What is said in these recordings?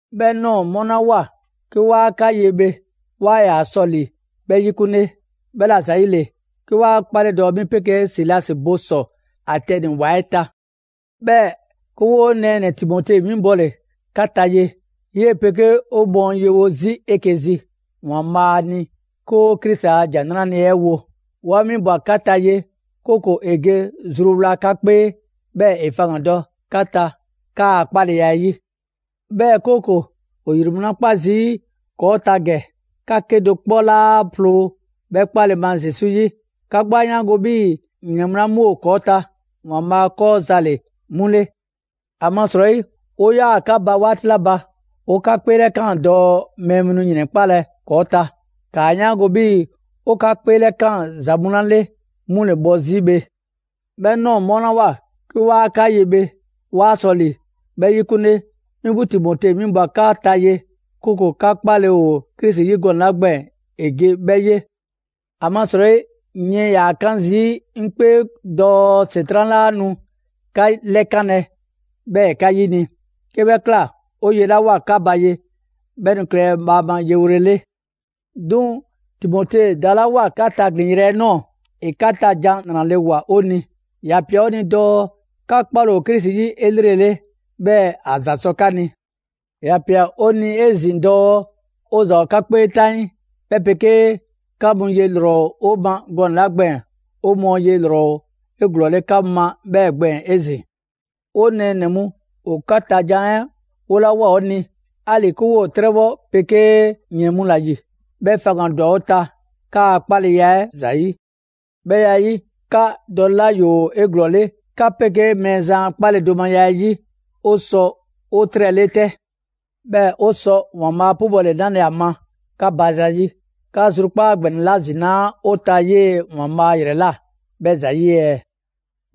'Bhɛ ꞊nɔɔ 'mɔlawoa 'ke 'waa 'ka ye bhe, 'waa ‑yaa sɔ ‑li 'bhɛ 'yikunle; 'bhɛla‑ ‑yile, 'ke 'wa 'kpale do dɔɔ 'mi 'pegee Silasi bo ‑sɔ Atɛni ‑wa 'ɛ ta. 'Bhɛɛ‑ 'ke 'woo nɛɛnɛ‑ Timote winbɔle 'ka ta ye. 'Yee‑ 'pegee 'o mɔɔ ‑o yewo 'zi 'eke‑ zi ‑Waanbhaa' ni 'ke 'o Krisi a ‑Jan 'Nrale‑ 'ɛ wo. 'Wa 'winbwa‑ 'ka ta ye, 'kooko‑ ‑e ge zruwla 'ka 'kpee, 'bhɛɛ‑ ‑e faŋgandɔ 'ka ta 'kaa‑ 'kpaleya 'ɛ 'yi. 'Bhɛɛ‑ 'kooko‑, ‑o ‑yrɛn mu 'la kpa zii' ‑kɔɔ' ta 'saanigɛ, 'ka 'kedo‑ 'kpɔ 'laa ploo 'bhɛ 'kpale‑ ma Zesu 'yi. 'Ka 'gbu 'a 'yaango‑ 'bhii‑ ‑yrɛn mu 'la 'mu ‑kɔɔ' ta, ‑Waanbhaa' 'kɔɔ ‑za ‑le 'mu ‑le. ‑Amasrɔyi 'o 'yaa‑ 'ka ba 'waati 'la ba, 'o 'ka 'kpeelɛkaan dɔɔ mɛɛ mu nu ‑yrɛnkpalɛ ‑kɔɔ' ta. ‑Kaa 'yaango‑ 'bhii‑ 'o 'ka 'kpeelɛkaan ‑za 'la mu 'le, 'mu ‑le bhɔ 'zi bhe. 'Bhɛ ꞊nɔɔ 'mɔlawoa 'ke 'waa 'ka ye bhe, 'waa ‑yaa sɔ ‑li 'bhɛ 'yikunle, mi 'gbu Timote 'winbwa‑ 'ka ta ye, 'kooko‑ 'ka 'kpale‑ ‑o Krisi 'yi gɔnɛ‑ 'la gbɛɛn‑ ‑e ge 'bhɛ 'ye. ‑Amasrɔyi yiɛn ‑yaa 'kan zii' 'ŋ 'kpee dɔɔ ‑Setran' 'laa nu 'ka 'lɛkanlɛ, 'bhɛɛ‑ ‑e 'ka 'yini‑. 'Ke 'bhɛ ꞊kla, 'o ye 'la ꞊woa 'ka ba ye, 'bhɛ nu klɛlɛ bhaama yewole 'le. 'Duŋ‑ Timote dalawoa 'ka taglin‑ yrɛ 'ɛ ꞊nɔɔ, ‑e 'ka ta jan 'nrale‑ ꞊woa 'o ni. ‑Ya ꞊pia 'o ni dɔɔ 'ka 'kpale‑ ‑o Krisi 'yi 'elrele, 'bhɛɛ‑ ‑a ‑za sɔ 'ka ni. ‑Ya ꞊pia 'o ni 'ezin‑ dɔɔ 'o ‑za ‑o 'ka 'kpee 'taŋii, 'bhɛ 'pegee 'ka mu ye ‑lrɔ 'o ma gɔnɛ‑ 'la gbɛɛn‑, 'o mɔɔ ye ‑lrɔ ‑o 'eglɔɔle 'ka mu ma 'bhɛɛ‑ gbɛɛn‑ 'ezin‑. 'O nɛɛnɛ‑ mu, ‑o 'ka ta jan 'ɛ 'wolawoa 'o ni, 'ali‑ 'ke 'woo‑ 'trɛbhɔ 'pegee ‑yrɛn mu ‑la ‑yi, 'bhɛ faŋgandwa 'o ta, 'kaa‑ 'kpaleya 'ɛ ‑zayi'. 'Bhɛ ya 'ɛ 'yi, 'ka dɔlela ‑yoo 'eglɔɔle 'ka 'pegee Mɛɛzan a 'kpaledomaya 'ɛ 'yi, 'o sɔ 'o 'trɛle 'tɛ. 'Bhɛɛ‑ 'o sɔ ‑Waanbhaa' 'pubɔle 'nale‑ ‑a ma 'ka ba zayi', 'ka zrukpaa' ‑gbɛnɛ 'la ‑zinaa' 'o ta 'yee‑ ‑Waanbhaa' ‑yrɛ ꞊la 'bhɛ ‑zayi' ɛɛ?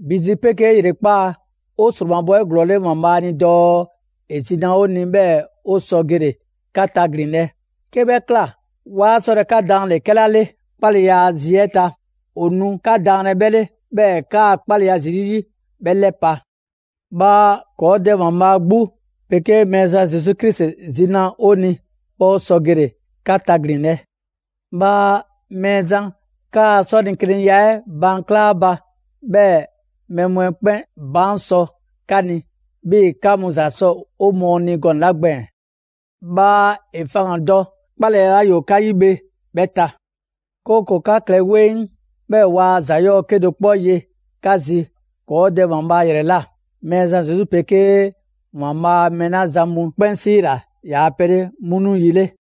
‑Bi zi 'pegee ‑yrekpaa', 'o ‑sromabɔ 'eglɔɔle ‑Waanbhaa' ni dɔɔ ‑e zi na 'o ni 'bhɛɛ‑ 'o sɔ gele‑ 'ka taglinlɛ. 'Ke 'bhɛ ꞊kla, 'waa 'sɔlɛ‑ 'ka daanle‑ 'kɛla 'le 'kpaleya a zi 'ɛ ta, ‑o nu 'ka daanlɛ 'bhɛ 'le, 'bhɛɛ‑ 'kaa‑ 'kpaleya Zesu 'yi 'bhɛ 'lɛpa‑. Bhaa ‑kɔɔ' Dɛ ‑Waanbhaa' 'gbu 'pegee Mɛɛzan Zesu Krisi zi na 'o ni, 'bhɛɛ‑ 'o sɔ gele‑ 'ka taglinlɛ. Bhaa Mɛɛzan kaa 'sɔlekeniya 'ɛ baan' kla 'a ba, 'bhɛɛ‑ mɛɛ mu 'ɛ 'kpɛn baan' sɔ 'ka ni, 'bhii‑ 'ka mu ‑za sɔ 'o mɔɔ ni gɔnɛ‑ 'la gbɛɛn‑. Bhaa ‑e faŋgandɔ 'kpaleya 'la ‑yoo 'ka 'yi bhe 'bhɛ ta; 'kooko‑ 'ka klɛ 'weŋ, 'bhɛɛ‑ waa ‑za 'yɔɔ‑ 'kedo‑ 'kpɔ ye 'ka zi ‑kɔɔ' Dɛ ‑Waanbhaa' ‑yrɛ ꞊la, Mɛɛzan Zesu 'pegee ‑Waanbhaa' mɛɛ 'la zan mu 'kpɛn 'siila‑ ‑yaa' pɛ 'le 'mu nu yi 'le.